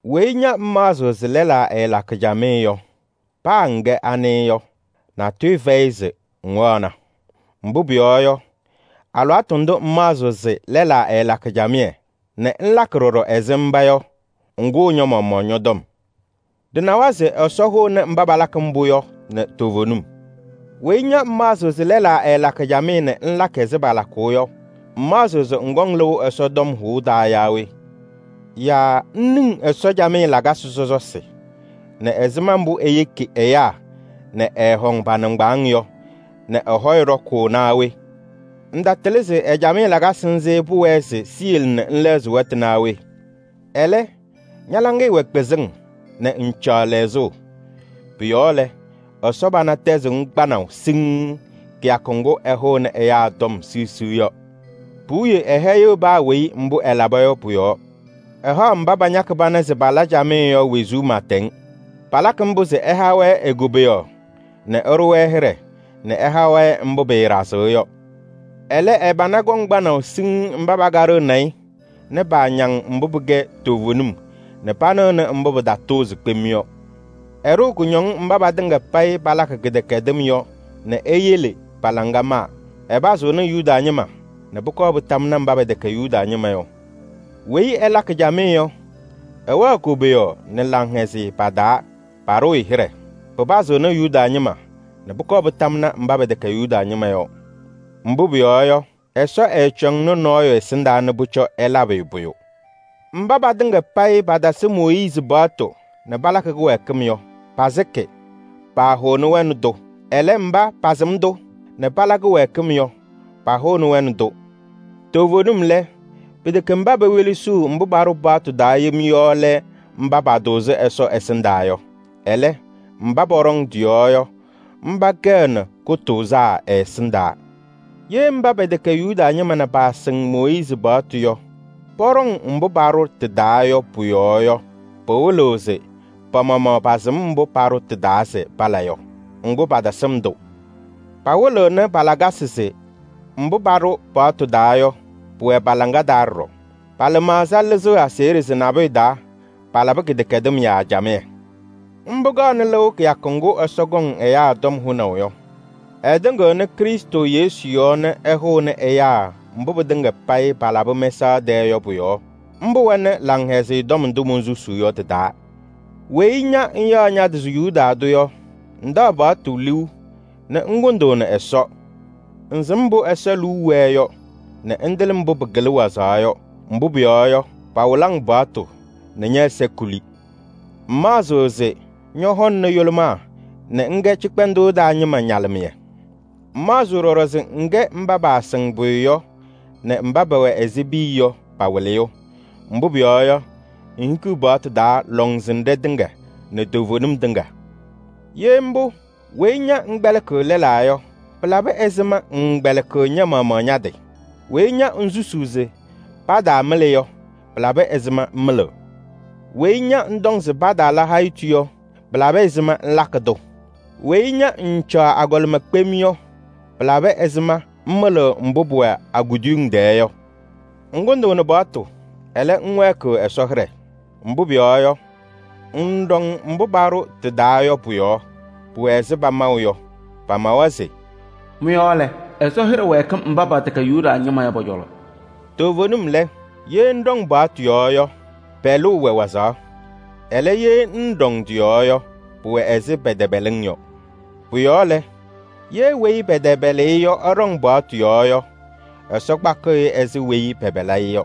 Weyi ña ŋmaɣzɩɣ se lɛlaa ɛɛlakɩ camɩyɛ yɔ, paa ŋkɛ we yɔ, natʋyʋ fɛyɩ se ŋwaɣna. Mbʋ pʋyɔɔ yɔ, alɩwaatʋ ndʋ ŋmaɣzɩɣ se lɛlaa ɛɛlakɩ camɩyɛ nɛ ŋlakɩ ɖɔɖɔ ɛzɩ mba yɔ, ŋkʋʋ ña-maɣmaɣ ñɔ-tɔm. Ɖɩnawa se Ɛsɔ hʋʋnɩ mba palakɩ mbʋ yɔ nɛ toovenim. Weyi ña ŋmaɣzɩɣ se lɛlaa ɛɛlakɩ camɩyɛ nɛ ŋlakɩ ɛzɩ palakʋʋ yɔ, ŋmaɣzɩɣ se ŋkɔŋ lɩʋ Ɛsɔ tɔm hʋʋ taa yaa we? Yaa ŋniŋ Ɛsɔ camɩyɛ lakasɩ sɔsɔsɩ nɛ ɛzɩma mbʋ eyeki ɛyaa nɛ ɛɛhɔŋ pa-nɩŋgbaaŋ yɔ nɛ ɛ-hɔyɛ ɖɔkʋʋ naa we? Ŋtatɩlɩ se ɛ-camɩyɛ lakasɩ nzɩ pʋwɛɛ se siyele nɛ ŋlɛɣzɩ wɛtʋ naa we? Ɛlɛ, ña-laŋɩyɛ wɛ kpɩzɩŋ nɛ ŋŋcaɣ lɛɣzʋʋ. Pʋ-yɔɔ lɛ, Ɛsɔ pana tɛzɩɣ-ŋ kpanaʋ siŋŋ kɩyakʋ ŋgʋ ɛhʋʋnɩ ɛyaa tɔm siɣsiɣ yɔ. Puwiye ɛhɛyɩɣ paa weyi mbʋ ɛlaba yɔ pʋ-yɔɔ: ɛhaɣ mba pañakɩ pana se pala camɩyɛ yɔ wezuu pɩɩtɛŋ. Palakɩ mbʋ se ɛha-wɛ e-koboyaɣ nɛ ɛɖʋ-wɛ hɩɖɛ nɛ ɛha-wɛ mbʋ pɩɩɖazɩɣ yɔ. Ɛlɛ, ɛ-pana kɔŋ kpanaʋ siŋŋ mba pakaɖɩɣnɩ-ɩ nɛ paañaŋ mbʋ pɩkɛ toovenim nɛ panɩɣnɩ mbʋ pɩtatʋʋzɩ kpem yɔ. Ɛɖʋʋ kʋñɔŋ mba patɩŋa payɩ palakɩ kɩdɛkɛdɩm yɔ nɛ eyele pa-laŋa maa. Ɛpazɩɣnɩ Yuda ñɩma nɛ pʋkɔɔ pɩtamnɩ mba pɛtɛkɛ Yuda ñɩma yɔ! Weyi ɛlakɩ camɩyɛ yɔ, ɛwɛɣ koboyaɣ nɛ laŋhɛzɩyɛ pa-taa, paɖʋʋ-ɩ hɩɖɛ. Pɩpazɩɣnɩ Yuda ñɩma nɛ pʋkɔɔ pɩtamnɩ mba pɛtɛkɛ Yuda ñɩma yɔ! Mbʋ pʋyɔɔ yɔ, Ɛsɔ ɛɛcɔŋnɩ nɔɔyʋ ɛsɩndaa se pʋcɔ ɛlabɩ-ɩ pʋyʋ. Mba patɩŋa payɩ patasɩ Mooyiizi paɣtʋ nɛ palakɩ kɩwɛɛkɩm yɔ, pasɩkɩ, paahʋʋnɩ-wɛ nɛ tʋ. Ɛlɛ, mba pasɩm-tʋ nɛ pala kɩwɛɛkɩm yɔ, pahʋʋnɩ-wɛ nɛ tʋ. Toovenim lɛ, pɩtɛkɛ mba pewelesiɣ mbʋ paɖʋ paɣtʋ taa yem yɔ lɛ mba patʋʋzɩ Ɛsɔ ɛsɩndaa yɔ. Ɛlɛ, mba pɔɖɔŋ tɩ-yɔɔ yɔ, mba kɛɣnɩ kʋtʋʋzaa ɛ-ɛsɩndaa. Ye mba pɛtɛkɛ Yuda ñɩma nɛ paasɩŋ Mooyiizi paɣtʋ yɔ, pɔɖɔŋ mbʋ paɖʋ tɩ-taa yɔ pʋ-yɔɔ yɔ, pɩwɩlɩɣ se pa-maɣmaɣ pasɩm mbʋ paɖʋ tɩ-taa se pala yɔ. Ŋgʋ, patasɩm-tʋ. Pawɩlɩɣnɩ pa-lakasɩ se mbʋ paɖʋ paɣtʋ taa yɔ, pʋwɛ pa-laŋa taa ɖɔɖɔ. Pa-lɩmaɣza lɩzɩɣ aseɣɖe se nabʋyʋ taa, palabɩ kɩdɛkɛdɩm yaa camɩyɛ. Mbʋ kaɣnɩ lɩʋ kɩyakʋ ŋgʋ Ɛsɔ kɔŋ ɛyaa tɔm hʋnaʋ yɔ. Ɛtɩŋɩɣnɩ Krɩstʋ Yesu yɔɔ nɛ ɛhʋnɩ ɛyaa mbʋ pɩtɩŋa payɩ palabɩ mɛsaɣ tɛɛ yɔ pʋ-yɔɔ. Mbʋ wɛnɩ Laŋhɛzɩyɛ Tɔm ndʋ monsusuu yɔ tɩ-taa. Weyi ña ŋyaɣ ña-tɩ se Yuda tʋ yɔ, ŋtaɣ paɣtʋ liu nɛ ŋkʋndʋʋnɩ Ɛsɔ. Ŋsɩm mbʋ Ɛsɔ liu wɛɛ yɔ, nɛ ŋtɩlɩ mbʋ pɩkɩlɩ wazaɣ yɔ. Mbʋ pʋyɔɔ yɔ, pawɩlɩ-ŋ paɣtʋ nɛ ñɛ-ɛza kuli. Ŋmaɣzɩɣ se ñɔhɔŋnɩ yʋlʋmaa nɛ ŋkɛ cɩkpɛndʋʋ taa ñɩma ñalɩmɩyɛ. Ŋmaɣzɩɣ ɖɔɖɔ se ŋkɛ mba paasɩŋ pʋyʋ yɔ nɛ mba pɛwɛ ɛzɩ piya yɔ pa-wɩlɩyʋ. Mbʋ pʋyɔɔ yɔ, ŋhikiɣ paɣtʋ taa lɔŋsɩnɖɛ tɩŋa nɛ toovenim tɩŋa. Ye mbʋ, weyi ña ŋkpɛlɩkɩɣ lɛlaa yɔ, pɩlabɩ ɛzɩma ŋŋkpɛlɩkɩɣ ña-maɣmaɣ ña-tɩ? Weyi ña ŋsusuu se pataamɩlɩ yɔ, pɩlabɩ ɛzɩma ŋmɩlɩɣ? Weyi ña ŋtɔŋ se pataala hayitu yɔ, pɩlabɩ ɛzɩma ŋlakɩ-tʋ? Weyi ña ŋŋcaɣ agɔlɩma kpem yɔ, pɩlabɩ ɛzɩma ŋmɩlɩɣ mbʋ pʋwɛ a-kuduyiŋ tɛɛ yɔ? Ŋkʋndʋʋnɩ paɣtʋ, ɛlɛ, ŋwɛɛkɩɣ Ɛsɔ hɩɖɛ. Mbʋ pʋyɔɔ yɔ, ŋŋɖɔŋ mbʋ paɖʋ tɩ-taa yɔ pʋ-yɔɔ. Pʋwɛ ɛzɩ pamaʋ yɔ, pamawa se: “Mɩ-yɔɔ lɛ, Ɛsɔ hɩɖɛ wɛɛkɩ mba pɛtɛkɛ Yuda ñɩma yɔ pɔ-cɔlɔ.” Toovenim lɛ, ye ŋɖɔŋ paɣtʋ yɔɔ yɔ, pɛlʋʋ wɛ wazaɣ. Ɛlɛ, ye ŋŋɖɔŋ tɩ-yɔɔ yɔ, pʋwɛ ɛzɩ pɛtɛpɛlɩ-ŋ yɔ. Pʋ-yɔɔ lɛ, ye kɩtɛpɛlʋʋ ɛɖɔŋ paɣtʋ yɔɔ yɔ, Ɛsɔ kpakɩɣ-kʋ ɛzɩ weyi pɛpɛlɩ-ɩ yɔ.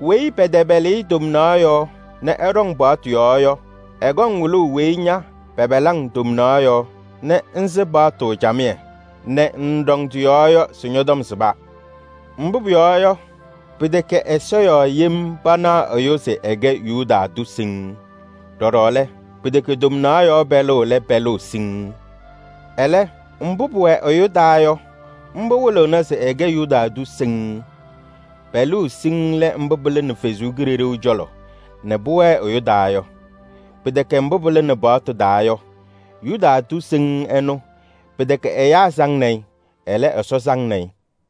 Weyi pɛtɛpɛlɩ-ɩ tomnaɣ yɔɔ nɛ ɛɖɔŋ paɣtʋ yɔɔ yɔ, ɛkɔŋ wɩlʋʋ weyi ña pɛpɛlɩ-ŋ tomnaɣ yɔɔ nɛ ŋsɩ paɣtʋ camɩyɛ nɛ ŋŋɖɔŋ tɩ-yɔɔ yɔ se ñɔ-tɔm sɩba. Mbʋ pʋyɔɔ yɔ, pɩtɛkɛ ɛza yɔɔ yem panaɣ ɛyʋ se ɛkɛ Yuda tʋ siŋŋ. Ɖɔɖɔ lɛ, pɩtɛkɛ tomnaɣ yɔɔ pɛlʋʋ lɛ pɛlʋʋ siŋŋ. Ɛlɛ, mbʋ pʋwɛ ɛyʋ taa yɔ, mbʋ wɩlɩɣna se ɛkɛ Yuda tʋ siŋŋ. Pɛlʋʋ siŋŋ lɛ mbʋ pɩlɩnɩ Ɛsɔ Kalɩzaɣ cɔlɔ nɛ pʋwɛɛ ɛyʋ taa yɔ. Pɩtɛkɛ mbʋ pɩlɩnɩ paɣtʋ taa yɔ. Yuda tʋ siŋŋ ɛnʋ, pɩtɛkɛ ɛyaa saŋnɩ-ɩ, ɛlɛ, Ɛsɔ saŋnɩ-ɩ.